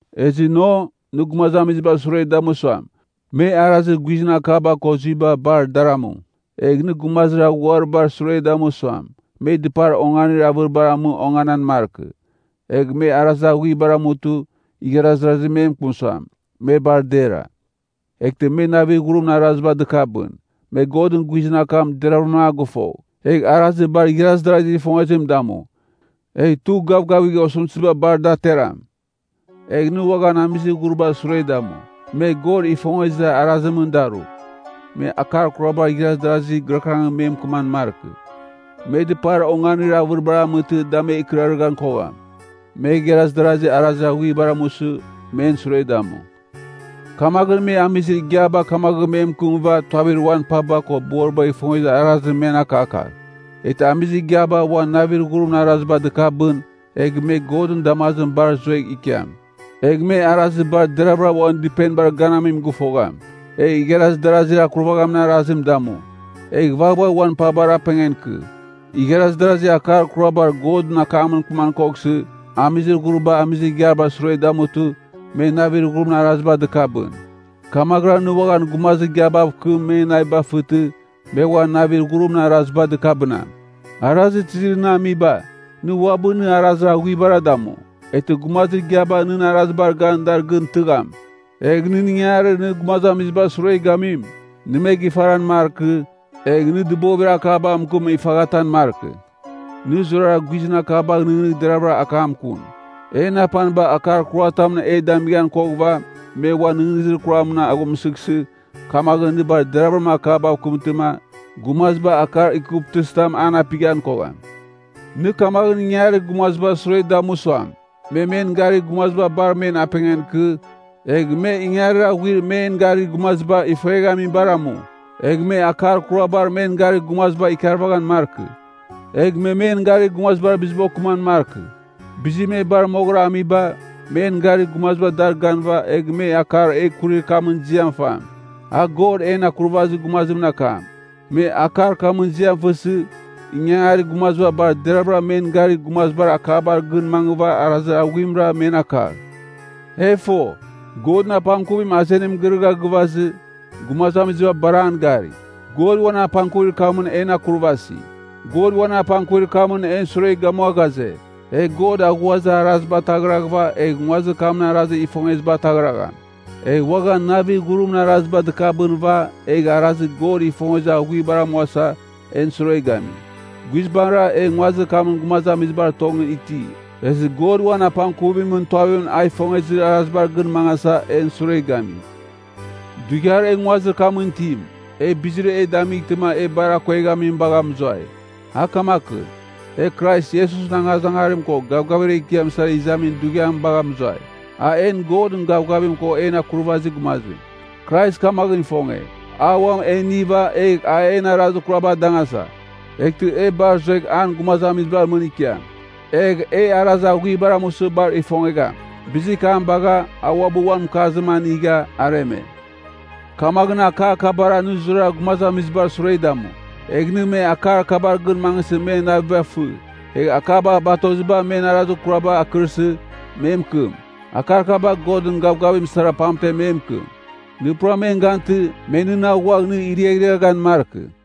Ezɨ no, nɨ gumazamizibar sure damu suam, me arazir guizɨn akaba ko zuiba bar dar amu. Egh nɨ gumazir ghuribar sure damu suam, me dɨpar onganir avɨribar amɨ onganan markɨ. Egh me arazir aghuibar amutɨ, igharaz darazi me mɨkɨm suam, me bar dera. Eghtɨ me navir ghurimɨn araziba dɨkabɨn. Me Godɨn guizɨn akam deravɨram a gɨfogh, egh arazir bar igharaz darazigh ifongezim damu, egh tugh gavgavigh osɨmtɨziba bar a da ateram. Egh nɨ uaghan amizir ghuribar sure damu suam, me God ifongezir arazimɨn daru. Me akar kurabar igharaz darazi gɨrakɨrangɨn me mɨkɨman markɨ. Me dɨpar onganir avɨriba amɨtɨ da me ikɨrarɨghan kogham. Me igharaz darasi arazir aghuibar amusɨ, men sure damu. Kamaghɨn me amizir igiaba kamaghɨn me mɨkɨmɨva tuavir uan paba ko boribagh ifongezir arazim men akakagh. Eghtɨ amizir igiaba uan navir ghurimɨn araziba dɨkabɨn, egh me Godɨn damazimɨn bar zuegh ikiam. Egh me arazir bar deravɨra uan dɨpenibar ganamim gɨfogham. Egh igharaz darazir akurvaghamin arazim damu. Egh vaghvagh uan pabar apengan ikɨ. Igharaz darazi akar kurabar Godɨn akamɨn mɨkɨman koghsɨ, amizir ghuriba amizir igiabar sure damutɨ, me navir ghurimɨn araziba dɨkabɨn. Kamaghɨra nɨ uaghan gumazir igiabav kɨm, men naviba fɨtɨ, me uan navir ghurimɨn araziba dɨkabɨnam. Arazir tizir nɨ amiba, nɨ uabɨ nɨ arazir aghuibara damu, eghtɨ gumazir igiaba nɨn arazibar gan dar gɨn tɨgham. Egh nɨn ingangarir nɨ gumazamizibar sure gamim, nɨ me gifaran markɨ, egh nɨ dɨbovir akabav mɨkɨm ifaghatan markɨ. Nɨ zurara guizɨn akabagh nɨghnɨgh deravɨram akam kun. En apaniba akar kuratamɨn e damighan koghɨva, me uan nɨghnɨzir kuramɨn aghumsɨghsɨ, kamaghɨn nɨ bar deravɨram akabav kɨmtɨma, gumaziba akar ikuvtɨzitam an apighan kogham. Nɨ kamaghɨn ingangarir gumazamizibar sure damu suam, me men garir gumaziba bar men apengan ikɨ, egh me ingangarir aghuir men garir gumaziba ifueghamibar amu. Egh me akar kurabar men garir gumaziba ikarvaghan markɨ. Egh me men garir gumazibar biziba okɨman markɨ. Bizir me bar moghɨra amiba, men garir gumaziba dar ganɨva egh me akar e kurir kamɨn ziam fam. A God en Akurvazir Gumazimɨn akam. Me akar kamɨn ziam fɨsɨ, ingangarir gumaziba bar deravɨra men garir gumazibar akabar gɨn mangɨva arazir aghuimra men akagh. E fo, Godɨn apangkuvim azenim girɨgha gɨvazɨ, gumazamiziba bar an gari. God uan apangkuvir kamɨn en akurvasi. God uan apangkuvir kamɨn en sure gamua ghaze, e God aghuazir araziba ataghraghɨva egh nguazir kamɨn arazir ifongeziba ataghragham. Egh uaghan navir ghurimɨn araziba dɨkabɨnɨva egh arazir God ifongezir aghuibar amuasa, en sure gami. Guizbangɨra e nguazir kamɨn gumazamizibar tongɨn iti, ezɨ God uan apangkuvimɨn tuavimɨn a ifongezir arazibar gɨn mangasa, en sure gami. Dughiar e nguazir kamɨn itim, e bizir e damightɨma e bar akueghamim bagha mɨzuai. A kamakɨn, e Krais Iesusɨn angazangarim ko gavgavir ekiam sara izamin dughiam bagha mɨzuai. An en Godɨn Gavgavim ko en Akurvazir Gumazim. Krais kamaghɨn ifonge, a uam e iniva egh a en arazir kuraba adangasa. Eghtɨ e bar zuegh an gumazamizibar mɨn ikiam. Egh e arazir aghuibar amusɨ bar ifongegham. Bizir kam bagha, a uabɨ uan mɨkarzim anigha, areme. Kamaghɨn akar kabara nɨ zurara gumazamizibar sure damu. Egh nɨ akar kabar gɨn mangɨsɨ men naviba fɨ. Egh akaba batoziba men arazir kuraba akɨrsɨ, me mɨkɨm. Akar kaba Godɨn gavgavim sara pamtem me mɨkɨm. Nɨ pura men gantɨ, me nɨn aghuagh nɨ iriaghriaghan markɨ.